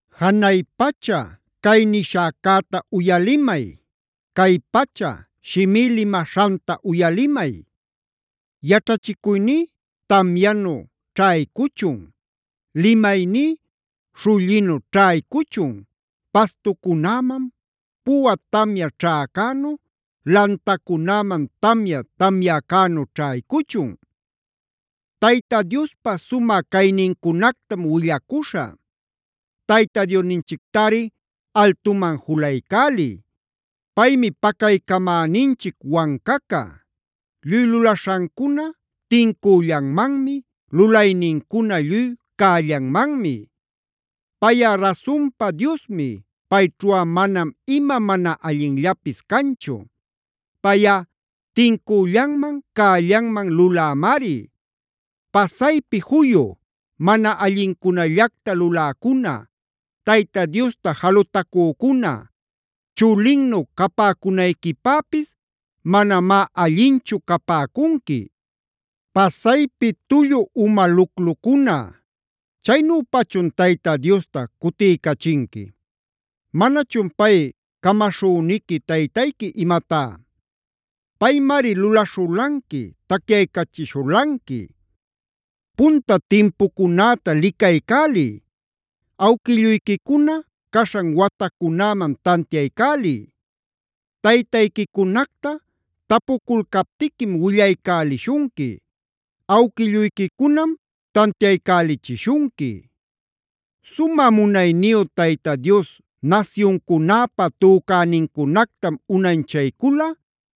“Janay pacha, cay nishäcäta uyalimay; cay pacha, shimí limaśhanta uyalimay. Yaćhachicuyní tamyanu ćhaycuchun; limayní śhullinu ćhaycuchun, pastucunäman puwa tamya ćhäcänu, lantacunäman tamya tamyäcänu ćhaycuchun. Tayta Diospa sumä caynincunactam willacuśhä. ¡Tayta Diosninchictari altuman juluycäliy! Paymi pacaycamäninchic wancaca; lluy lulaśhancuna tincüllanmanmi, lulaynincuna lluy cällanmanmi. Payꞌa rasunpa Diosmi, payćhuꞌa manam ima mana allinllapis canchu. Payꞌa tincüllanman, cällanman lulämari. “Pasaypi juyu, mana allincunallacta luläcuna, Tayta Diosta jalutacücuna, chulinnu capäcunayquipäpis manamá allinchu capäcunqui. Pasaypi tullu uma luclucuna, ¿chaynüpachun Tayta Diosta cutiycachinqui? ¿Manachun pay camaśhüniqui taytayqui imatá? Paymari lulaśhulanqui, tacyaycachishulanqui. Punta timpucunäta licaycäliy; awquilluyquicuna caśhan watacunäman tantiaycäliy. Taytayquicunacta tapuculcaptiquim willaycälishunqui; awquilluyquicunam tantiaycälichishunqui. Sumä munayniyu Tayta Dios nasyuncunäpä tücänincunactam unanchaycula,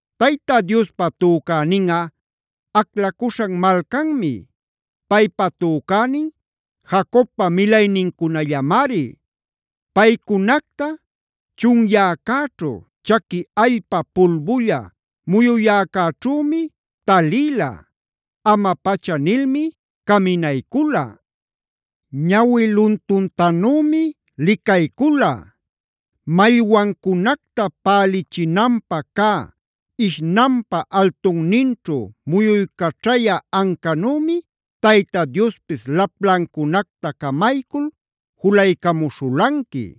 “Tayta Diospa tücäninꞌa aclacuśhan malcanmi; paypa tücänin Jacobpa milaynincunallamari. Paycunacta chunyäcäćhu, chaqui allpa pulbulla muyuyäcäćhümi talïla. Ama-pacha nilmi caminaycula; ñawi luluntanümi licaycula. Mallwancunacta pälichinanpä cä ishnanpä altunninćhu muyuycaćhayä ancanümi Tayta Diospis laplancunacta camaycul julaycamuśhulanqui;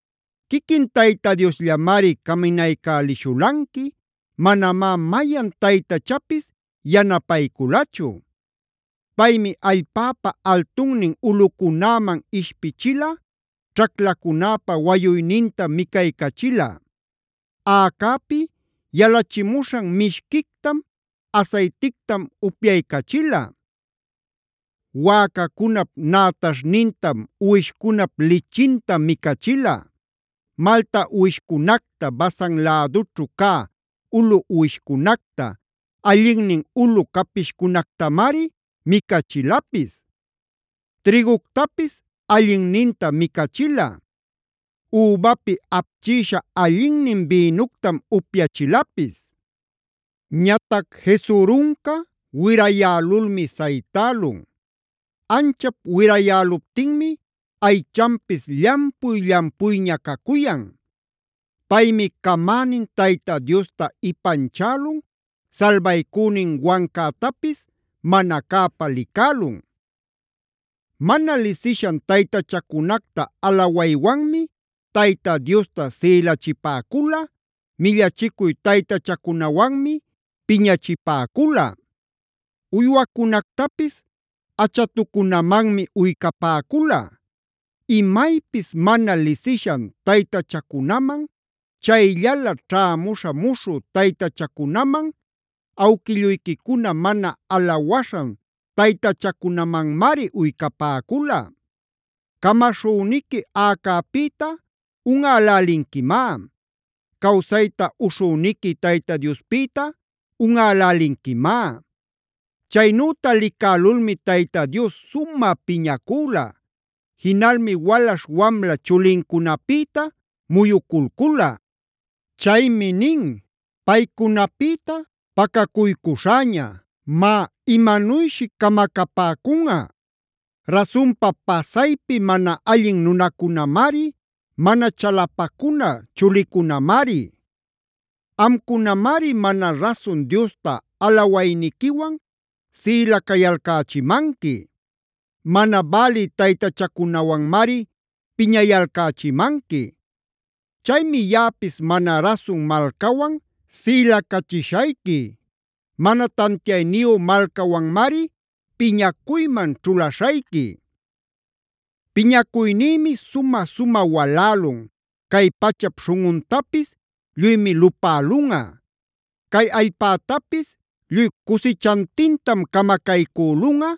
Quiquin Tayta Diosllamari caminaycälishulanqui, manamá mayan taytachapis yanapayculachu. Paymi allpäpa altunnin ulꞌucunäman ishpichila, ćhaclacunäpä wayuynintam micaycachila; aꞌacäpi yalachimuśhan mishquictam, asaytictam upyaycachila. Wäcacunap nätaśhnintam, uwishcunap lichintam micachila. Malta uwishcunacta, Basan lädućhu cä ulu uwishcunacta, allinnin ulu capishcunactamari micachilapis. Trïguctapis allinnintam micachila; übapi apchïsha allinnin bïnuctam upyachilapis. “Ñatac Jesuruncade wirayälulmi saytälun. Anchap wirayäluptinmi aychanpis llampuy-llampuyña cacuyan. Paymi camänin Tayta Diosta ipanchälun, salbaycünin wancätapis mana cäpä licälun. Mana lisishan taytachacunacta alawaywanmi Tayta Diosta sïlachipäcula, millachicuy taytachacunawanmi piñachipäcula. Uywacunactapis Achatucunamanmi uycapäcula;f imaypis mana lisishan taytachacunaman, chayllala ćhämuśhä muśhü taytachacunaman, awquilluyquicuna mana alawaśhan taytachacunamanmari uycapäcula. Camaśhüniqui aꞌacäpïta unꞌälälinquimá; cawsayta uśhüniqui Tayta Diospïta unꞌälälinquimá. “Chaynüta licälulmi Tayta Dios sumä piñacüla; jinalmi walaśh wamla chulincunapïta muyuculcula. Chaymi nin: ‘Paycunapïta pacacuycuśhäña; má imanuyshi camacapäcunꞌa. Rasunpa pasaypi mana allin nunacunamari, mana chalapacuna chulicunamari. Amcunamari mana rasun Diosta alawayniquiwan sïlacayalcächimanqui;g mana bälï taytachacunawanmari piñayalcächimanqui. Chaymi yaꞌapis mana rasun malcawan sïlacachishayqui;h mana tantiayniyu malcawanmari piñacuyman ćhulaśhayqui. Piñacuynïmi sumä-sumä walälun, cay pachap śhunꞌuntapis lluymi lupälunꞌa. Cay allpätapis lluy cusichantintam camacaycülunꞌa,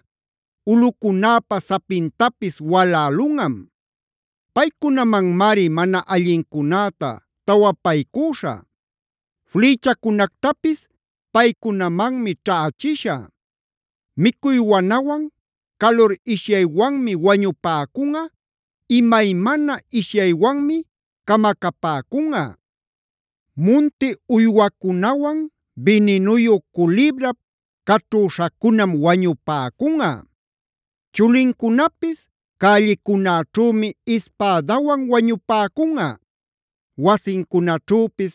ulꞌucunäpa sapintapis walälunꞌam. Paycunamanmari mana allincunäta tawapaycüśhä; flïchacunactapis paycunamanmi ćhächishä. Micuy wanawan, calur ishyaywanmi wañupäcunꞌa, imaymana ishyaywanmi camacapäcunꞌa; munti uywacunawan bininuyu culibrap caćhüśhacunam wañupäcunꞌa. Chulincunapis cällicunäćhümi ispädawan wañupäcunꞌa; wasincunaćhüpis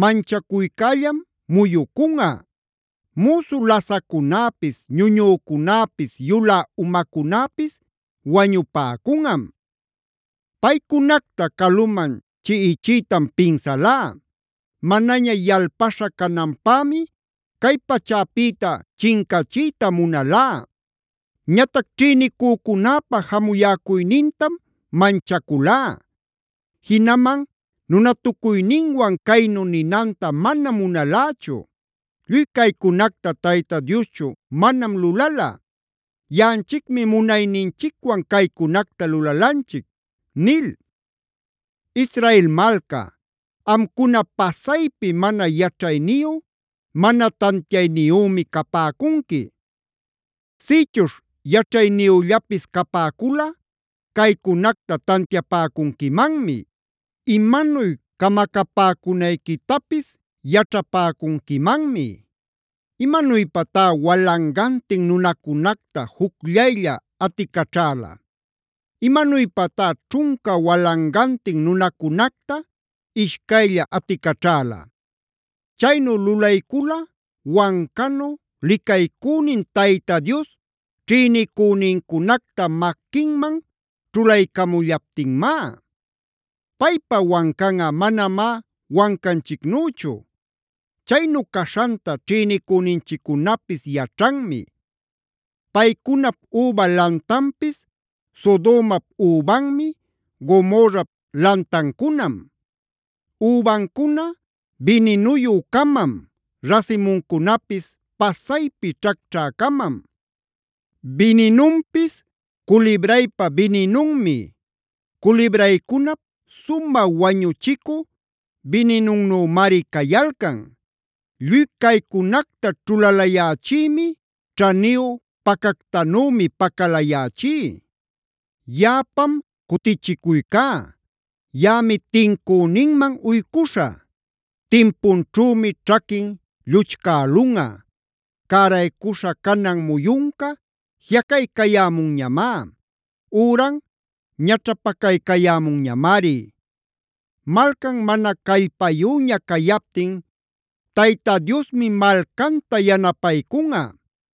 manchacuycällam muyucunꞌa. Müsu lasaccunäpis, ñuñücunäpis yulä umacunäpis wañupäcunꞌam. Paycunacta caluman chiꞌichiytam pinsalá; manaña yalpaśha cananpämi cay pachäpïta chincachiyta munalá. Ñatac ćhïnicücunäpa jamuyäcuynintam manchaculá; jinaman nunatucuyninwan caynu ninanta manam munalächu: “Lluy caycunacta Tayta Dioschu manam lulala; yaꞌanchicmi munayninchicwan caycunacta lulalanchic” ’ nil. “Israel malca, amcuna pasaypi mana yaćhayniyu, mana tantiayniyümi capäcunqui. Sïchuśh yaćhayniyüllapis capäculꞌa caycunacta tantiapäcunquimanmi; imanuy camacapäcunayquitapis yaćhapäcunquimanmi. ¿Imanuypatá walangantin nunacunacta jucllaylla aticaćhäla? ¿Imanuypatá ćhunca walangantin nunacunacta ishcaylla aticaćhäla? Chaynu lulaycula wancanu licaycünin Tayta Dios ćhïnicünincunacta maquinman ćhulaycamullaptinmá. Paypa wancanꞌa manamá Wancanchicnüchu. Chaynu caśhanta ćhïnicüninchiccunapis yaćhanmi. Paycunap üba lantanpis Sodomap übanmi, Gomorrap lantancunam; übancuna bininuyü-camam, rasimuncunapis pasaypi ćhacćhä-camam. Bininunpis culibraypa bininunmi; culibraycunap sumä wañuchicü bininunnümari cayalcan. “Lluy caycunacta ćhulalayächïmi; ćhaniyu pacactanümi pacalayächí. Yaꞌapam cutichicuycá; yaꞌami tincüninman uycuśhä.i Timpunćhümi ćhaquin lluchcälunꞌa. Cäraycuśha canan muyunca jiꞌacaycayämunñamá; üran ñaćhapacaycayämunñamari. “Malcan mana callpayüña cayaptin Tayta Diosmi malcanta yanapaycunꞌa.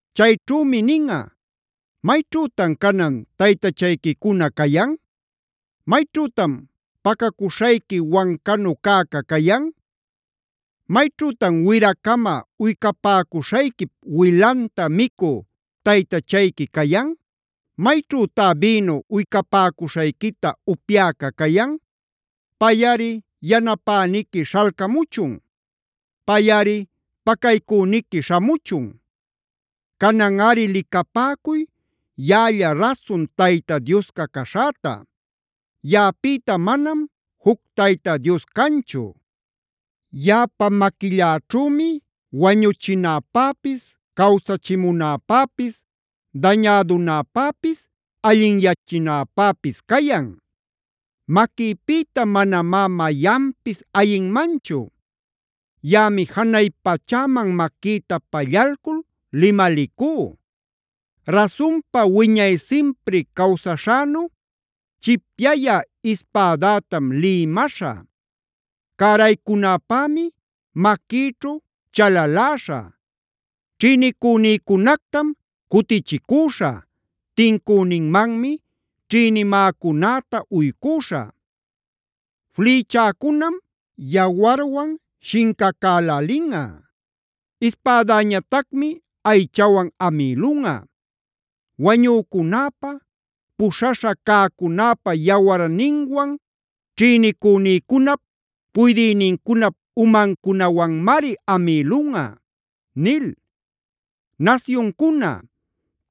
Chayćhümi ninꞌa: ‘¿Mayćhütan canan taytachayquicuna cayan? ¿Mayćhütan pacacuśhayqui wancanu cäca cayan? ¿Mayćhütan wira-cama uycapäcuśhayquip wilanta micü taytachayqui cayan? ¿Mayćhütá bïnu uycapäcuśhayquita upyäca cayan? ¡Payꞌari yanapäniqui śhalcamuchun! ¡Payꞌari pacaycüniqui śhamuchun! Cananꞌari licapäcuy yaꞌalla rasun Tayta Diosca caśhäta. Yaꞌapïta manam juc Tayta Dios canchu. Yaꞌapa maquilläćhümi wañuchinäpäpis cawsachimunäpäpis, dañädunäpäpis allinyachinäpäpis cayan. Maquïpïta manamá mayanpis ayinmanchu. Yaꞌami janay pachäman maquïta pallalcul limalicú: Rasunpa wiñay simpri cawsaśhänu, chipyayä ispädätam lïmäśhä; cäraycunäpämi maquïćhu chalaläśhä. Ćhïnicünïcunactam cutichicüśhä, tincüninmanmi ćhïnimäcunäta uycüśhä. Flïchäcunam yawarwan shincacalälinꞌa. Ispädäñatacmi aychawan amïlunꞌa; wañücunäpa, puśhaśhä cäcunäpa yawarninwan, ćhïnicünïcunap puydïnincunap umancunawanmari amïlunꞌa’ nil. “Nasyuncuna,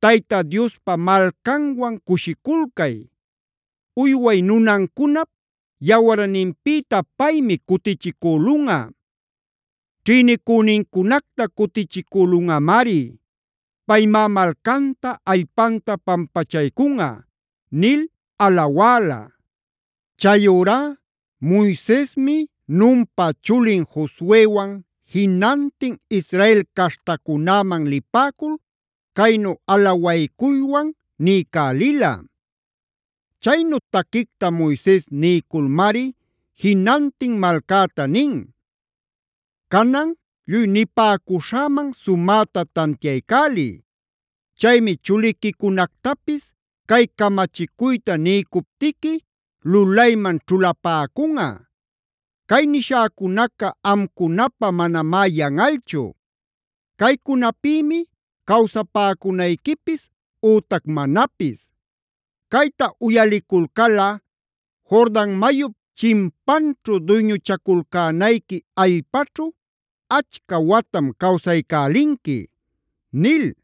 Tayta Diospa malcanwan cushiculcay.k Uyway nunancunap yawarninpïta paymi cutichicülunꞌa.l Ćhïnicünincunacta cutichicülunꞌamari; paymá malcanta allpanta pampachaycunꞌa” nil alawäla. Chayurá Moisesmi Nunpa chulin Josuewan jinantin Israel caśhtacunäman lipäcul caynu alawacuywan niycälila. Chaynu taquicta Moises niyculmari jinantin malcäta nin: “Canan lluy nipäcuśhäman sumäta tantiaycäliy. Chaymi chuliquicunactapis cay camachicuyta niycuptiqui lulayman ćhulapäcunꞌa. Cay nishäcunaca amcunapä manamá yanꞌalchu; caycunapïmi cawsapäcunayquipis ütac manapis. Cayta uyaliculcalꞌa Jordan mayup chimpanćhu duyñuchaculcänayqui allpaćhu achca watam cawsaycälinqui” nil.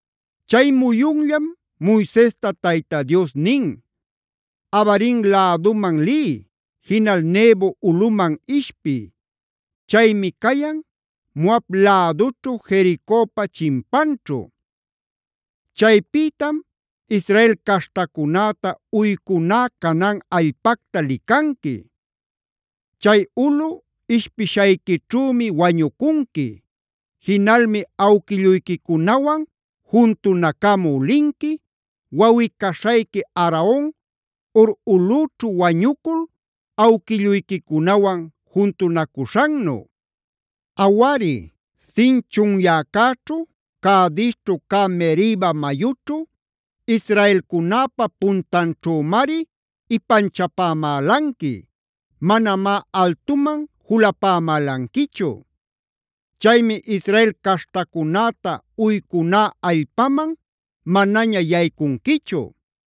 Chay muyunllam Moisesta Tayta Dios nin: “Abarim läduman liy; jinal Nebo ulꞌuman ishpiy. Chaymi cayan Moab lädućhu Jericopa chimpanćhu. Chaypïtam Israel caśhtacunäta uycuná Canaan allpacta licanqui. Chay ulꞌu ishpishayquićhümi wañucunqui. Jinalmi awquilluyquicunawan juntunacamü linqui, wawꞌi-caśhayqui Aaron Hor ulꞌüćhu wañucul awquilluyquicunawan juntunacuśhannu. Awari, Zin chunyäcäćhu, Cadesćhu cä Meriba mayućhu, israelcunäpa puntanćhümari ipanchapämälanqui; manamá altuman julapamälanquichu. Chaymi Israel caśhtacunäta uycuná allpaman manaña yaycunquichu.